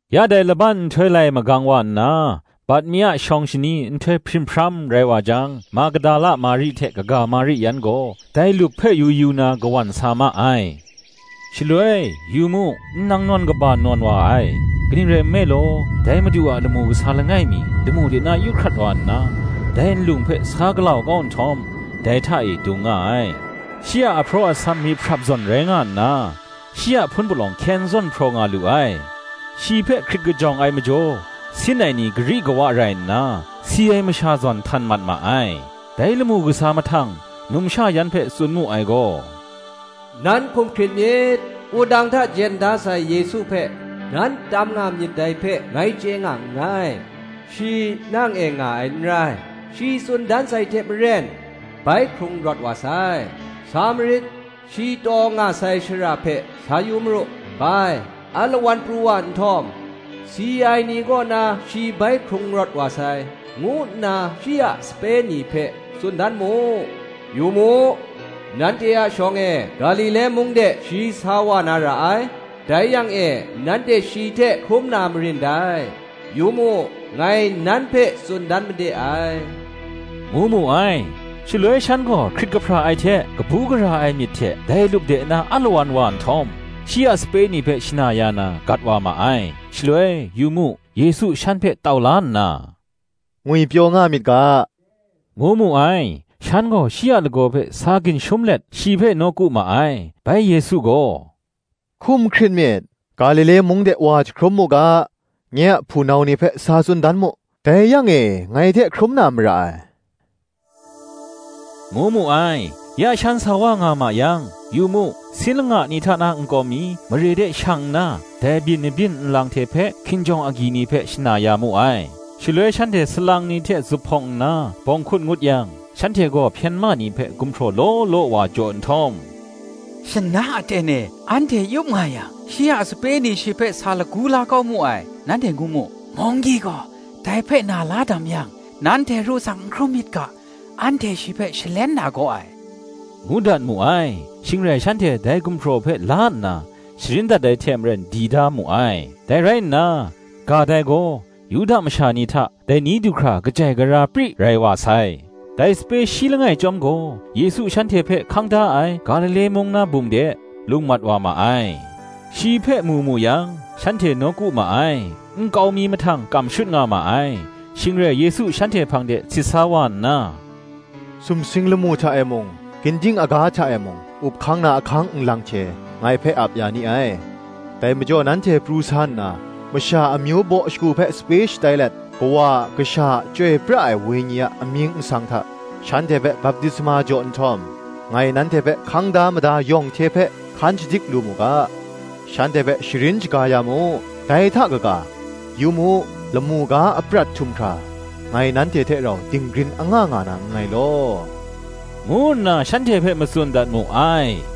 Ya dai laban nhtoi lai magang wa nna, bat mi a shawng shani nhtoi hprim hpram rai wa jang, Magdala Mari hte kaga Mari yan gaw, dai lup hpe yu yu na kawan sa ma ai. Shaloi, yu mu, nnang nawn kaba nawn wa ai: kaning rai nme law, dai Madu a lamu kasa langai mi, lamu de na yu hkrat wa nna dai nlung hpe sa galau kau nhtawm, dai hta e dung nga ai. Shi a ahpraw asam myihprap zawn rai nga nna, shi a hpun palawng hkyen zawn hpraw nga lu ai. Shi hpe hkrit kajawng ai majaw, sin ai ni gari kawa rai nna, si ai masha zawn htan mat ma ai. Dai lamu kasa mahtang, numsha yan hpe tsun mu ai gaw, Nan hkum hkrit myit; wudang hta jen da sai Yesu hpe, nan tam nga myit dai hpe ngai chye nga nngai: shi nang e nga ai n rai; shi tsun dan sai hte maren bai hkrung rawt wa sai: sa marit; shi taw nga sai shara hpe sa yu maru. Bai, alawan pru wa nhtawm, Si ai ni kaw na shi bai hkrung rawt wa sai, ngu nna shi a sape ni hpe tsun dan mu: yu mu, nanhte a shawng e, Galile mung de shi sa wa na ra ai; dai yang e nanhte shi hte hkrum na marin dai: yu mu, ngai nan hpe tsun dan made ai, ngu mu ai. Shaloi shan gaw hkrit kahpra ai hte kabu gara ai myit kaba hte dai lup de na alawan wa nhtawm, shi a sape ni hpe shana ya na, gat wa ma ai. Shaloi, yu mu, Yesu shan hpe tau la nna, Ngwipyaw nga myit ga, ngu mu ai: shan gaw shi a lagaw hpe sa ginshum let shi hpe nawku ma ai. Bai Yesu gaw, Hkum hkrit myit; Galile mung de wa jahkrum mu ga, nye a hpunau ni hpe sa tsun dan mu; dai yang e, ngai hte hkrum na mara ai, ngu mu ai. Ya shan sa wa nga ma yang, yu mu, sin langa ni hta na nkau mi, mare de shang nna, dai byin mahbyin nlang hte hpe hkinjawng agyi ni hpe shana ya mu ai. Shaloi shanhte salang ni hte zuphpawng nna bawng hkut ngut yang, shanhte gaw hpyen ma ni hpe gumhpraw law law wa jaw nhtawm, Shana aten e, anhte yup nga yang, shi a sape ni shi hpe sa lagu la kau mu ai, nanhte ngu mu. Munggyi gaw dai lam hpe na la dam yang, nanhte ru tsang n hkrum myit ga, anhte shi hpe shalen na gaw ai, ngu dat mu ai. Shing rai shanhte dai gumhpraw hpe la nna, sharin dat ai hte maren di da mu ai: dai rai nna, ga dai gaw, Yuda masha ni hta, dai ni du hkra kajai gara pri rai wa sai. Dai sape shi langai chyawm gaw, Yesu shanhte hpe hkang da ai Galile mung na bum de, lung mat wa ma ai. Shi hpe mu mu yang, shanhte nawku ma ai; nkau mi mahtang kam shut nga ma ai. Shing rai Yesu shanhte hpang de sit sa wa nna, Sumsing lamu hta e mung, ginding aga hta e mung, up hkang na ahkang nlang hte, ngai hpe ap ya ni ai. Dai majaw nanhte pru sa nna, masha amyu baw shagu hpe sape shatai let, Kawa a, Kasha a, Chyoi pra ai Wenyi a amying nsang hta, shanhte hpe baptisma jaw nhtawm, ngai nanhte hpe hkang da mada yawng hte hpe hkan shadik lu mu ga, shanhte hpe sharin shaga ya mu: dai hta kaga, yu mu, lamu ga aprat htum hkra, ngai nanhte hte rau dinggrin anga nga na nngai law, ngu nna shanhte hpe matsun dat mu ai.